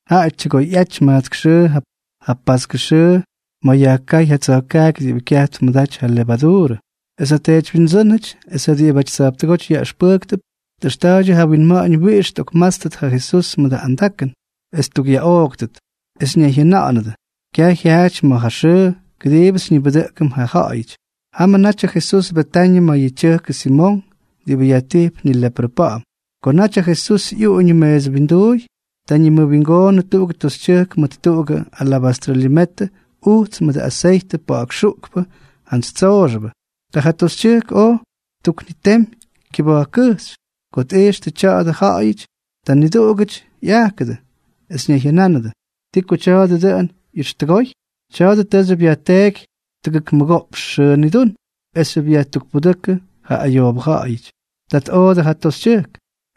Jaꞌa tyʉgoyꞌaty majtsk xʉʉ ja paskʉ xʉʉ ma̱ yajkáy ja tsa̱jkaaky diꞌibʉ kyaj tmʉdaty yʉ levaduurʉ, es ja teedywyindsʉ́nʉty es ja diꞌibʉty tsa̱jptʉgóty yaꞌʉxpʉjktʉp tꞌʉxta̱a̱ydyʉ ja winma̱ꞌa̱ñ wiꞌix tꞌokmátstʉt ja Jesús mʉdʉ andakʉn, es ttukꞌyaꞌooktʉt. Es ñayjyʉnánʉdʉ: —Kyaj jyaaty ma̱ ja xʉʉ kʉdiibʉ xyñibʉdʉꞌkʉm ja ja̱ꞌa̱yʉty. Jamʉ natyʉ Jesús Betañʉ ma̱ yʉ tyʉjkʉ Simonk diꞌibʉ yajtijp nileprʉ pa̱ꞌa̱m. Ko naty ja Jesús ꞌyuꞌuñʉ meesʉ winduuy, ta ñimʉwingoonʉ tuꞌugʉ toxytyʉjk mʉt tuꞌugʉ alabastrʉ limetʉ ujts mʉdʉ aseytʉ pa̱ꞌa̱k xuꞌkpʉ jantsy tsooxʉbʉ. Ta ja toxytyʉjk oj ttuknitemy kyʉba̱jkkʉjxy. Ko tꞌijxtʉ tya̱a̱dʉ ja ja̱ꞌa̱yʉty, ta niduꞌugʉty ꞌyajkʉdʉ, es ñayjyʉnánʉdʉ: —¿Ti ko tya̱a̱dʉ dʉꞌʉn tʉ ꞌyʉxtʉgoy? Tya̱a̱dʉ tʉʉxyʉp yajteeky tʉgʉk mʉgoꞌpx xʉʉ nidún, esxyʉp yajtukpudʉ́kʉdʉ ja ayoobʉ ja̱ꞌa̱yʉty. Ta tꞌoodʉ ja toxytyʉjk.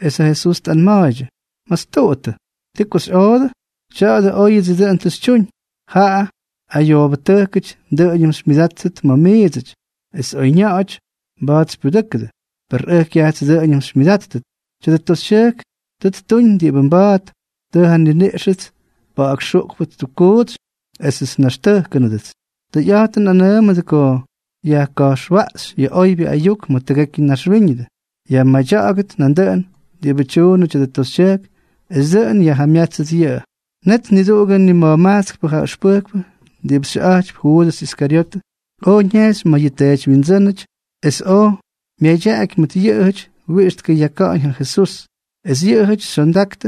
Es ja Jesús tꞌanma̱a̱ydyʉ: —Mastuꞌuttʉ. ¿Ti ko xyꞌoodʉ? Tya̱a̱dʉ óyʉdsʉ dʉꞌʉn tʉ xytyuñ. Ja ayoobʉtʉjkʉty dʉꞌʉñʉm xymyʉdáttʉt ma̱ miidsʉty, es oyña̱ꞌa̱ty mba̱a̱t xypyudʉ́kʉdʉt. Per ʉj kyajts dʉꞌʉñʉm xymyʉdáttʉt. Tya̱dʉ toxytyʉjk tʉ ttuñ diꞌibʉ mba̱a̱t, tʉ ja nniniꞌxʉts pa̱ꞌa̱k xuꞌkpʉ ttukkuutsy esʉts nnaxtʉjkʉnʉdʉts. Tʉyꞌa̱jtʉn nꞌanʉʉmʉdʉ ko yajka̱jxwaꞌxy yʉ oybyʉ ayuk ma̱ tʉgekyʉ naxwíñʉdʉ, yajmadya̱ꞌa̱gʉt nandʉꞌʉn diꞌibʉ tyuunʉ tya̱dʉ toxytyʉjk, es dʉꞌʉn yajjamyátsʉt yʉꞌʉ. Net niduꞌugʉ nima̱jmajtskpʉ ja ʉxpʉjkpʉ diꞌibʉ xyʉꞌa̱jtypy Juudʉs Iskaryotʉ, oj ñejxy ma̱ ja teedywyindsʉ́nʉty es oj myadyaꞌaky mʉt yʉꞌʉjʉty wiꞌix tkʉyaka̱ꞌa̱ñ ja Jesús. Es yʉꞌʉjʉty xyondaktʉ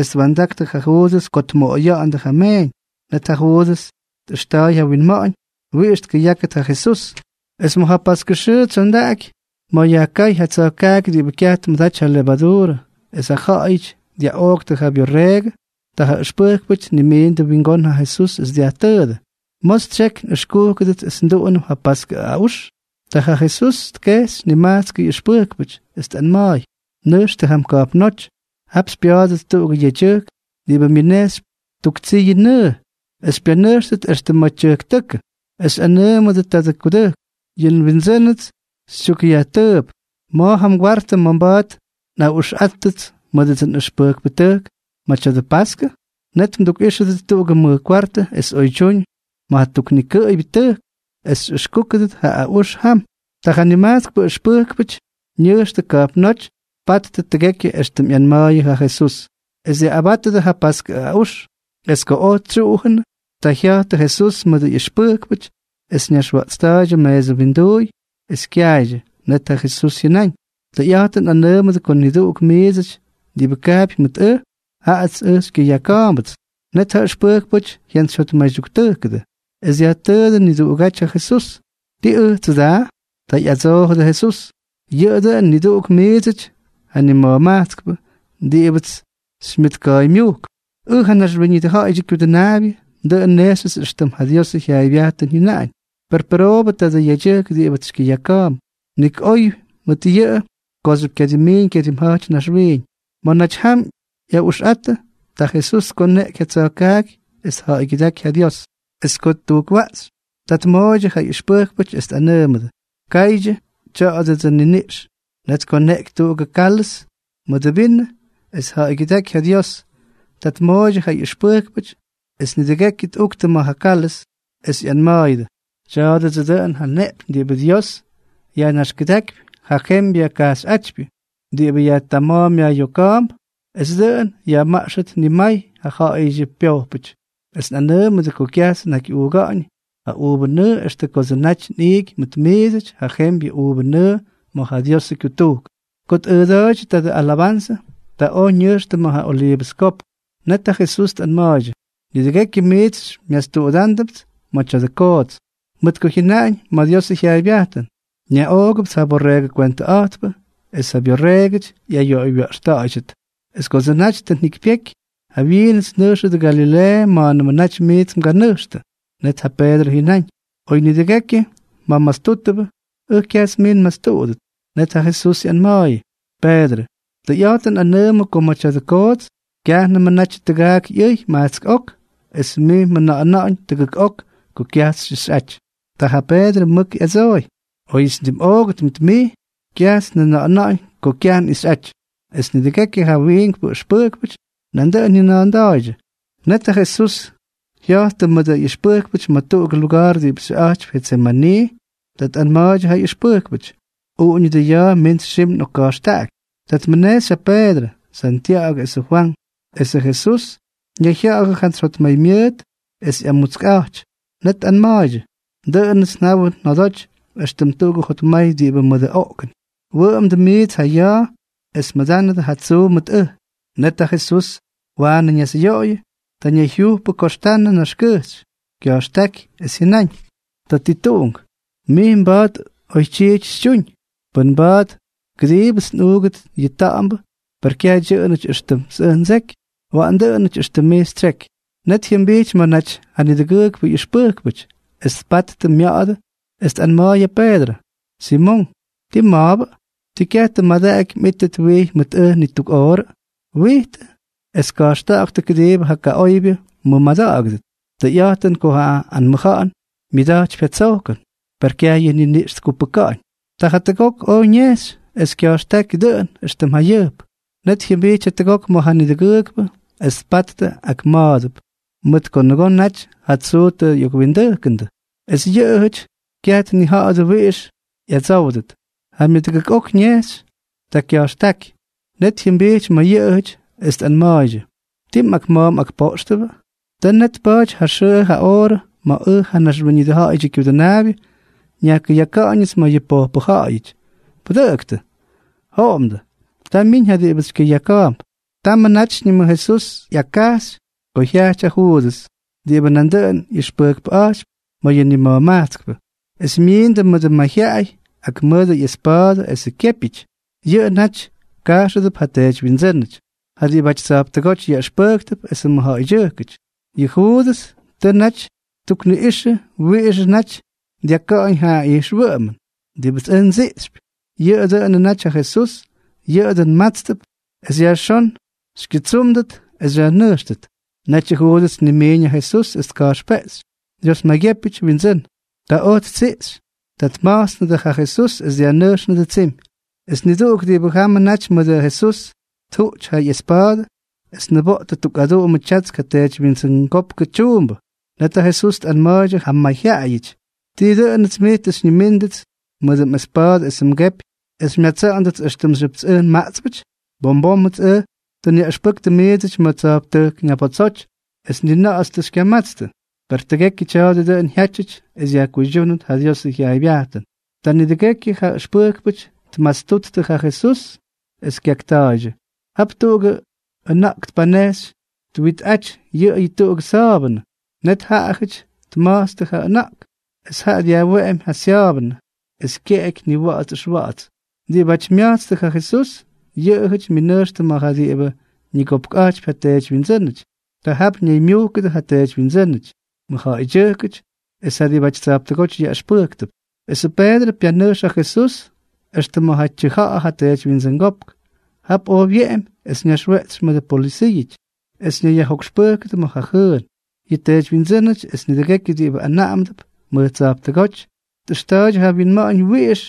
es twa̱ndaktʉ ja Juudʉs ko tmoꞌoya̱ꞌa̱ndʉ ja meeñ. Net ja Juudʉs tꞌʉxta̱a̱y ja winma̱ꞌa̱ñ wiꞌix tkʉyákʉt ja Jesús. Es ma̱ ja paskʉ xʉʉ tsyondaky, ma̱ yajkáy ja tsa̱jkaaky diꞌibʉ kyaj tmʉdaty ja levaduurʉ, es ja ja̱ꞌa̱yʉty dyaꞌooktʉ ja byorreegʉ, ta ja ʉxpʉjkpʉty tnimiindʉ wingón ja Jesús es dyajtʉʉdʉ: —¿Ma̱ xytsyeky nꞌʉxkúkʉdʉts es nduꞌunʉm ja paskʉ aꞌux? Ta ja Jesús tkejxy nimajtskʉ ꞌyʉxpʉjkpʉty, es tꞌanma̱a̱y: —Nʉjxtʉ jam ka̱jpnóty. Jap xypya̱a̱dʉt tuꞌugʉ yedyʉjk diꞌibʉ myʉnejxypy tuk tsiyʉ nʉʉ, es xypyanʉjxtʉt extʉ ma̱ tyʉjktʉ́kʉ, es xyꞌanʉʉmʉdʉ tadʉ kudʉjk: “Yʉ nWindsʉ́nʉts xytyukꞌyajtʉʉp: ¿Ma̱ ja kwartʉ ma̱ mba̱a̱t nꞌaꞌuxꞌáttʉdʉts mʉdʉdsʉ nꞌʉxpʉjkpʉtʉjk ma̱ tya̱dʉ paskʉ?” Net mdukꞌíxʉdʉt tuꞌugʉ mʉj kwartʉ es oydyúñ ma̱ ja tuknikʉꞌʉybyʉ tʉjk, es xyꞌʉxkúkʉt ja aꞌux jam. Ta ja nimajtsk ʉxpʉjkpʉty ñʉjxtʉ ka̱jpnóty es tpattʉ tʉgekyʉ éxtʉm ꞌyanma̱a̱yʉ ja Jesús, es dyaꞌꞌabátʉdʉ ja paskʉ aꞌux. Es ko oj tsyuꞌujʉnʉ, ta jya̱jttʉ Jesús mʉdʉ ꞌyʉxpʉjkpʉty, es ñaxwaꞌtsta̱a̱ydyʉ meesʉ winduuy, es kyaydyʉ. Net ja Jesús jyʉnáñ: —Tʉyꞌa̱jtʉn nꞌanʉʉmʉdʉ ko niduꞌuk miidsʉty diꞌibʉ kaapy mʉt ʉj, jaꞌats ʉj xykyʉyaka̱a̱mbʉts. Net ja ʉxpʉjkpʉty jyantsyjyotmaydyuktʉjkʉdʉ, es dyajtʉʉdʉ niduꞌugáty ja Jesús: —¿Tii ʉjtsʉ daa? Ta ꞌyadsoojʉdʉ Jesús: —Yʉꞌʉ dʉꞌʉn niduꞌuk miidsʉty ja nima̱jmajtskpʉ diꞌibʉts xymyʉtka̱a̱ymyujkp. Ʉj, ja Naxwíñʉdʉ Ja̱ꞌa̱yʉdyʉ Kyudʉnaabyʉ, dʉꞌʉn nnejxyʉts éxtʉm ja Diosʉ jyaaybyajtʉn jyʉnaꞌañ. Per pʉroobʉ tadʉ yedyʉjk diꞌibʉts xykyʉyaka̱a̱mp. Nik oy mʉt yʉꞌʉ kooxyʉp kyadimmiiñ kyadimja̱jty naxwiiñ. Ma̱ naty jam ꞌyaꞌuxꞌattʉ, ta Jesús tkoneꞌky ja tsa̱jkaaky es tja̱ꞌa̱ygyʉdáky ja Dios. Es ko ttujkwaꞌxy, ta tmooydyʉ ja ꞌyʉxpʉjkpʉty, es tꞌanʉʉmʉdʉ: —Kaydyʉ. Tya̱a̱dʉdsʉ nniniꞌx. Net tkoneꞌky tuꞌugʉ kálʉz mʉdʉ vinʉ es tja̱ꞌa̱ygyʉdaꞌaky ja Dios. Ta tmooydyʉ ja ꞌyʉxpʉjkpʉty, es nidʉgekyʉ ꞌyuktʉ ma̱ ja kálʉz, es ꞌyanma̱a̱yʉdʉ: —Tya̱a̱dʉdsʉ dʉꞌʉn ja nneꞌpyñ diꞌibʉ Dios yajnaxkʉdákypy ja jembyʉ kajxyꞌátypyʉ, diꞌibʉ yajtama̱a̱n yajꞌyoka̱a̱mp es dʉꞌʉn yajmaꞌxʉt nimay ja ja̱ꞌa̱yʉdyʉ pyojpʉty. Es nꞌanʉʉmʉdʉ ko kyajts nnakyꞌuuga̱ꞌa̱ñ ja uuvʉ nʉʉ extʉ kodsʉ naty nꞌiiky mʉt miidsʉty ja jembyʉ uuvʉ nʉʉ ma̱ ja Diosʉ kyutujkʉn. Ko tꞌʉʉda̱a̱ydyʉ tuꞌugʉ alabanzʉ, ta oj ñʉjxtʉ ma̱ ja Oliivʉs Kopk. Net ja Jesús tꞌanma̱a̱ydyʉ: —Nidʉgekyʉ miits xymyastuꞌudándʉpts ma̱ tya̱dʉ koots. Mʉt ko jyʉnaꞌañ ma̱ Diosʉ jyaaybyajtʉn: “Nyaꞌoogʉpts ja borreegʉ kwentʉꞌa̱jtpʉ, es ja byorreegʉty ꞌyayoꞌoywya̱ꞌxta̱ꞌa̱ydyʉt.” Es kodsʉ naty tʉ njikypyeky, jawyiinʉts nnʉjxʉt Galileeʉ ma̱a̱nʉmʉ naty miits mganʉjxtʉ. Net ja Peedrʉ jyʉnáñ: —Oy nidʉgekyʉ mjamastútʉbʉ, ʉj kyajts mij nmastuꞌudʉt. Net ja Jesús ꞌyanma̱a̱yʉ: —Peedrʉ, tʉyꞌa̱jtʉn nꞌanʉʉmʉ ko ma̱ tya̱dʉ koots, kyajnʉmʉ natyʉ tʉgaak ꞌyʉy majtsk ok, es mij mjʉna̱ꞌa̱na̱ꞌa̱ñ tʉgʉk ok ko kyajts xyꞌixꞌaty. Ta ja Peedrʉ mʉk ꞌyadsooy: —Oyʉts ndimꞌoogʉt mʉt mij, kyajts njʉna̱ꞌa̱na̱ꞌa̱ñ ko kyaj nꞌixꞌaty. Es nidʉgekyʉ ja wiink ʉxpʉjkpʉty nandʉꞌʉn jyʉna̱a̱nda̱a̱ydyʉ. Net ja Jesús jya̱jttʉ mʉdʉ ꞌyʉxpʉjkpʉty ma̱ tuꞌugʉ luga̱a̱r diꞌibʉ xyʉꞌa̱jtypy Jetsemanii. Ta tꞌanma̱a̱ydyʉ ja ꞌyʉxpʉjkpʉty: —Uꞌuñʉdʉ ya̱a̱ mints xim nꞌokka̱jxtaꞌaky. Ta tmʉnejxy ja Peedrʉ, Santya̱ꞌa̱gʉ esʉ Fwank, esʉ Jesús ñayjya̱ꞌa̱jʉ jantsy jotmaymyʉʉt es ꞌyamutskꞌa̱jty. Net tꞌanma̱a̱ydyʉ: —Dʉꞌʉnʉts njawʉ njodoty éxtʉm tuꞌugʉ jotmay diꞌibʉ mʉdʉ oꞌkʉn. Wʉꞌʉmdʉ miits ja ya̱a̱ es mʉdánʉdʉ ja tsuu mʉt ʉj. Net ja Jesús waanʉ ñasꞌyoꞌoyʉ. Ta ñayjyujpʉ koxtanʉ naxkʉjxy, kya̱jxtáky es jyʉnáñ: —Tatituꞌunk, mij mba̱a̱t oytyiity xytyuñ. Pʉn mba̱a̱t, kʉdiibʉts nꞌuugʉt yʉ ta̱ꞌa̱mbʉ. Per kyaj dyʉꞌʉnʉty éxtʉmts ʉj ndseky, waꞌan dʉꞌʉn éxtʉm mij xytsyeky. Net jyʉmbijty ma̱ naty ja nidʉgʉʉkpʉ ꞌyʉxpʉjkpʉty, es tpattʉ mya̱ꞌa̱dʉ, es tꞌanma̱a̱y ja Peedrʉ: —Simonk, ¿tii mma̱a̱bʉ? ¿Ti kyaj tʉ mmadaꞌaky mꞌítʉt wijy mʉt ʉj ni tuk oorʉ? Wijtʉ es ka̱jxta̱ꞌa̱ktʉ kʉdiibʉ ja kaꞌoybyʉ mmʉmada̱ꞌa̱gʉdʉt. Tʉyꞌa̱jtʉn ko ja anmʉja̱ꞌa̱n myʉda̱jtypy ja tsojkʉn, per kyaj yʉ niniꞌx tkupʉka̱ꞌa̱ñ. Ta jatʉgok oj ñejxy, es kya̱jxtáky dʉꞌʉn éxtʉm jayʉjp. Net jyʉmbijty jatʉgok ma̱ ja nidʉgʉʉkpʉ, es tpattʉ ak ma̱a̱dʉp, mʉt ko nʉgoo naty ja tsuu tʉ ꞌyokwindʉjkʉndʉ. Es yʉꞌʉjʉty kyaj tnija̱ꞌa̱dʉ wiꞌix ꞌyadsówdʉt. Ja myʉdʉgʉk ok oj ñejxy. Ta kya̱jxtáky. Net jyʉmbijty ma̱ yʉꞌʉjʉty, es tꞌanma̱a̱ydyʉ: —¿Tii mꞌakma̱a̱ mꞌakpoꞌxtʉbʉ? Tʉ net tpa̱a̱ty ja xʉʉ ja oorʉ ma̱ ʉj, ja Naxwíñʉdʉ Ja̱ꞌa̱yʉdyʉ Kyudʉnaabyʉ, nyajkʉyaka̱ꞌa̱ñʉts ma̱ yʉ pojpʉ ja̱ꞌa̱yʉty. ¡Pʉdʉꞌʉktʉ! ¡Joꞌomdʉ! Ta myiñ ja diꞌibʉts xykyʉyaka̱a̱mp. Tamʉ natyñʉmʉ Jesús ꞌyakkajxy ko jyajty ja Juudʉs diꞌibʉ nandʉꞌʉn ꞌyʉxpʉjkpʉꞌa̱jtypy ma̱ yʉ nima̱jmajtskpʉ, es myindʉ mʉdʉ mayjyaꞌay ak mʉdʉ ꞌyespa̱a̱dʉ esʉ kyépyʉty. Yʉꞌʉ naty kajxʉdʉp ja teedywyindsʉ́nʉty, ja diꞌibʉty tsa̱jptʉgóty yaꞌʉxpʉjktʉp esʉ mʉjja̱ꞌa̱ydyʉjkʉty. Yʉ Juudʉs tʉ naty ttukniꞌꞌixʉ wiꞌixʉ naty dyaka̱ꞌa̱ñ ja ijxwʉꞌʉmʉn: —Diꞌibʉts ʉj ndsiꞌxypy, yʉꞌʉ dʉꞌʉnʉ naty ja Jesús. Yʉꞌʉ dʉꞌʉn mmátstʉp es yajxón xykyʉtsúmdʉt es xyajnʉjxtʉt. Netyʉ Juudʉs tnimiiñ ja Jesús es tka̱jxpeꞌxy: —Dios maygyépyʉty, Windsʉ́n. Ta oj ttsiꞌxy. Ta tma̱jtsnʉdʉ ja Jesús es dyajnʉjxnʉdʉ tsimy. Es niduꞌuk diꞌibʉ jamʉ naty mʉdʉ Jesús tjuꞌty ja ꞌyespa̱a̱dʉ es tniboꞌtʉ tuk aduꞌumʉ tyatsk ja teedywyindsʉngópkʉ tyuumbʉ. Net ja Jesús tꞌanma̱a̱ydyʉ ja mayjyaꞌayʉty: —¿Tii dʉꞌʉnʉts miits tʉ xyñimíndʉts mʉdʉ mꞌespa̱a̱dʉ esʉ mgepy es xymyatsa̱ꞌa̱ndʉts éxtʉmxyʉpts ʉj nmaꞌtspʉty? Bom bómʉts ʉj tʉ nyaꞌʉxpʉktʉ miidsʉty mʉj tsa̱jptʉjk ñabotsoty, es ni na̱ꞌa̱ts tʉ xykyamatstʉ. Per tʉgekyʉ tya̱a̱dʉ dʉꞌʉn jyátyʉty es yajkuydyúnʉt ja Diosʉ jyaaybyajtʉn. Ta nidʉgekyʉ ja ʉxpʉjkpʉty tmastuttʉ ja Jesús, es kyakta̱a̱ydyʉ. Jap tuꞌugʉ ʉna̱ꞌk tpanejxy twitꞌaty yʉꞌʉyʉ tuꞌugʉ sa̱a̱bʉnʉ. Net ja ja̱ꞌa̱yʉty tma̱jtstʉ ja ʉna̱ꞌk, es jaꞌa dyajweꞌemy ja sya̱a̱bʉnʉ es kyeky niwa̱ꞌa̱ts ʉxwa̱ꞌa̱ts. Diꞌibáty mya̱jtstʉ ja Jesús, yʉꞌʉjʉty myʉnʉjxtʉ ma̱ ja diꞌibʉ ñigopkꞌa̱jtypy ja teedywyindsʉ́nʉty. Ta jap ñaymyujkʉdʉ ja teedywyindsʉ́nʉty, mʉjja̱ꞌa̱ydyʉjkʉty es ja diꞌibʉty tsa̱jptʉgóty yaꞌʉxpʉjktʉp. Esʉ Peedrʉ pyanʉjx ja Jesús extʉ ma̱ ja tyʉja̱ꞌa̱ ja teedywyindsʉngópk. Jap oj wyeꞌemy es ñaxweꞌtsy mʉdʉ polʉsiiʉty, es ñayyajjokxpʉ́kʉdʉ ma̱ ja jʉʉn. Yʉ teedywyindsʉ́nʉty es nidʉgekyʉ diꞌibʉ anaꞌamdʉp mʉj tsa̱jptʉgóty tꞌʉxta̱ꞌa̱ydyʉ ja winma̱ꞌa̱ñ wiꞌix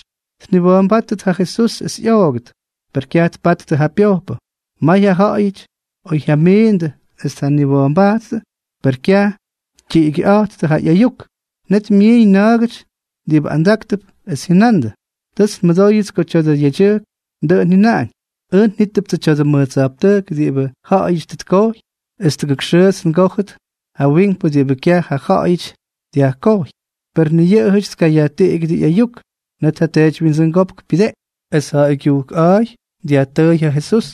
tniwa̱a̱mbáttʉt ja Jesús es ꞌyoogʉt. Per kyaj tpattʉ ja pyojpʉ. May ja ja̱ꞌa̱yʉty oj jyamindʉ es tjaniwa̱a̱mbajttʉ, per kyaj tyiꞌigyʉꞌáttʉ ja ꞌyayuk. Net myiiñ na̱a̱gʉty diꞌibʉ andáktʉp, es jyʉnandʉ: —Tʉts nmʉdóyʉts ko tya̱dʉ yedyʉjk dʉꞌʉn jyʉnaꞌañ: “Ʉj njítʉptsʉ tya̱dʉ mʉj tsa̱jptʉjk diꞌibʉ ja̱ꞌa̱yʉty tʉ tkojy, es tʉgʉk xʉʉts ngójʉt ja wiinkpʉ diꞌibʉ kyaj ja ja̱ꞌa̱yʉty dyajkojy.” Per ni yʉꞌʉjʉty tkayajtiꞌigyʉdʉ ꞌyayuk. Net ja teedywyindsʉngópk pyʉdeꞌky, es ja̱ꞌa̱y kyujkꞌa̱a̱y dyajtʉʉy ja Jesús: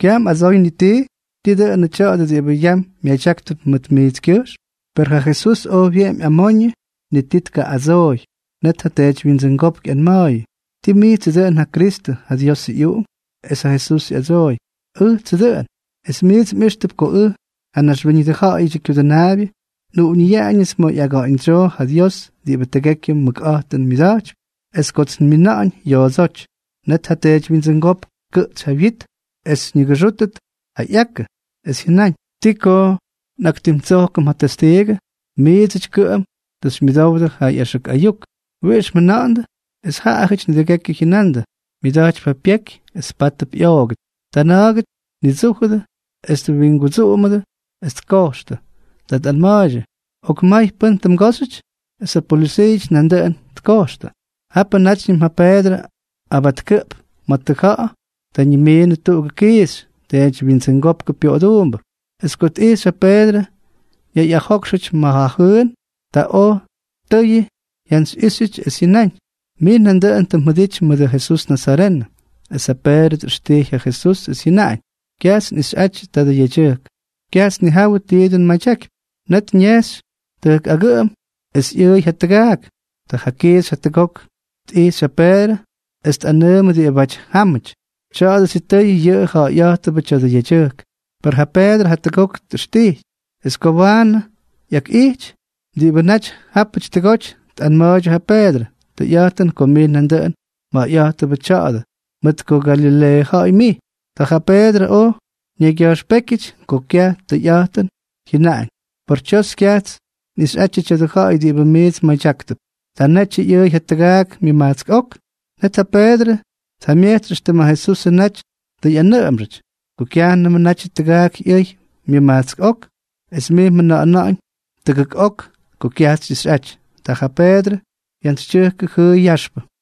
—¿Kyaj mꞌadsoy ni tii? ¿Tii dʉnʉ tya̱a̱dʉ diꞌibʉ yam myadyáktʉp mʉt mijtskyʉjxm? Per ja Jesús oj wyeꞌemy amoñʉ, ni ti tkaꞌꞌadsooy. Net ja teedywyindsʉngópk ꞌyanma̱a̱yʉ: —¿Tii mijtsʉ dʉꞌʉn ja Kristʉ, ja Diosʉ ꞌyUꞌunk? Es ja Jesús ꞌyadsooy: —Ʉjtsʉ dʉꞌʉn. Es miits mꞌíxtʉp ko ʉj, ja Naxwíñʉdʉ Ja̱ꞌa̱yʉdyʉ Kyudʉnaabyʉ, nꞌuꞌuñʉyaꞌañʉts ma̱ ꞌyaga̱ꞌa̱ñdsyoo ja Dios diꞌibʉ tʉgekyʉ mʉkꞌa̱jtʉn myʉda̱jtypy, es kots nmina̱ꞌa̱ñ yoodsóty. Net ja teedywyindsʉngópk tkʉꞌtsy ja wyit es ñʉgʉxʉꞌʉgʉt ja ꞌyakʉ, es jyʉnáñ: —¿Ti ko nꞌaktimtsojkʉm ja testiigʉ? Miidsʉty kʉꞌʉm tʉ xymyʉdowdʉ yʉ ꞌyaxʉk ayuk. ¿Wiꞌix mjʉna̱ꞌa̱ndʉ? Es jaꞌajʉty nidʉgekyʉ jyʉnandʉ: —Myʉda̱jtypy ja pyeky es pátʉp ꞌyoogʉt. Ta na̱a̱gʉty tnidsújʉdʉ, es twingudsuꞌumʉdʉ es tkojxtʉ. Ta tꞌanma̱a̱ydyʉ: —¡Okmay! ¿Pʉ́n tʉ mgóxyʉty? Es ja polʉsiiʉty nandʉꞌʉn tkojxtʉ. Japʉ nátyñʉm ja Peedrʉ abatkʉꞌp ma̱ tʉja̱ꞌa̱. Ta ñimiinʉ tuꞌugʉ kiixy, teedywyindsʉngópkʉ pyoꞌoduumbʉ. Es ko tꞌixy ja Peedrʉ ñayꞌajókxʉty ma̱ ja jʉʉn, ta oj tʉyʉ tjantsyꞌixy es jyʉnáñ: —Mij nandʉꞌʉn tʉ mjʉdity mʉdʉ Jesús nazarenʉ. Es ja Peedrʉ tꞌʉxtijy ja Jesús, es jyʉnáñ: —Kyajts nꞌixyꞌatyʉ tadʉ yedyʉjk. Kyajts nnijawʉ ti dʉn mmadyakypy. Net ñejxy tʉjk agʉꞌʉm, es ꞌyʉʉy ja tʉgaak. Ta ja kiixy jatʉgok tꞌijxy ja Peedrʉ es tꞌanʉʉmʉdʉ diꞌibáty jámʉty: —Tya̱a̱dʉ, sitʉy yʉꞌʉ ja̱ꞌa̱yꞌa̱jtʉbʉ tya̱dʉ yedyʉjk. Per ja Peedrʉ jatʉgok tꞌʉxtijy. Es ko waanʉ ꞌyakꞌijty, diꞌibʉ naty jápʉty jatʉgok tꞌanma̱a̱ydyʉ ja Peedrʉ: —Tʉyꞌa̱jtʉn ko mij nandʉꞌʉn mja̱ꞌa̱yꞌa̱jtʉbʉ tya̱a̱dʉ, mʉt ko Galileeʉ ja̱ꞌa̱y mij. Ta ja Peedrʉ oj ñaygya̱jxpékyʉty ko kyaj tʉyꞌa̱jtʉn, es jyʉnáñ: —Por tsyos, kyajts nꞌixyꞌatyʉ tya̱dʉ ja̱ꞌa̱y diꞌibʉ miits mmadyáktʉp. Ta netyʉ ꞌyʉʉy ja tʉgaak myʉmajtsk ok. Net ja Peedrʉ tjamyejtsy éxtʉm ja Jesusʉ naty tʉ ꞌyanʉꞌʉmxʉty: “Ko kyajnʉmʉ natyʉ tʉgaak ꞌyʉy myʉmajtsk ok, es mij mjʉna̱ꞌa̱na̱ꞌa̱ñ tʉgʉk ok ko kyajts xyꞌixꞌaty.” Ta ja Peedrʉ jyantsytyʉjkʉ jʉʉy yaxpʉ.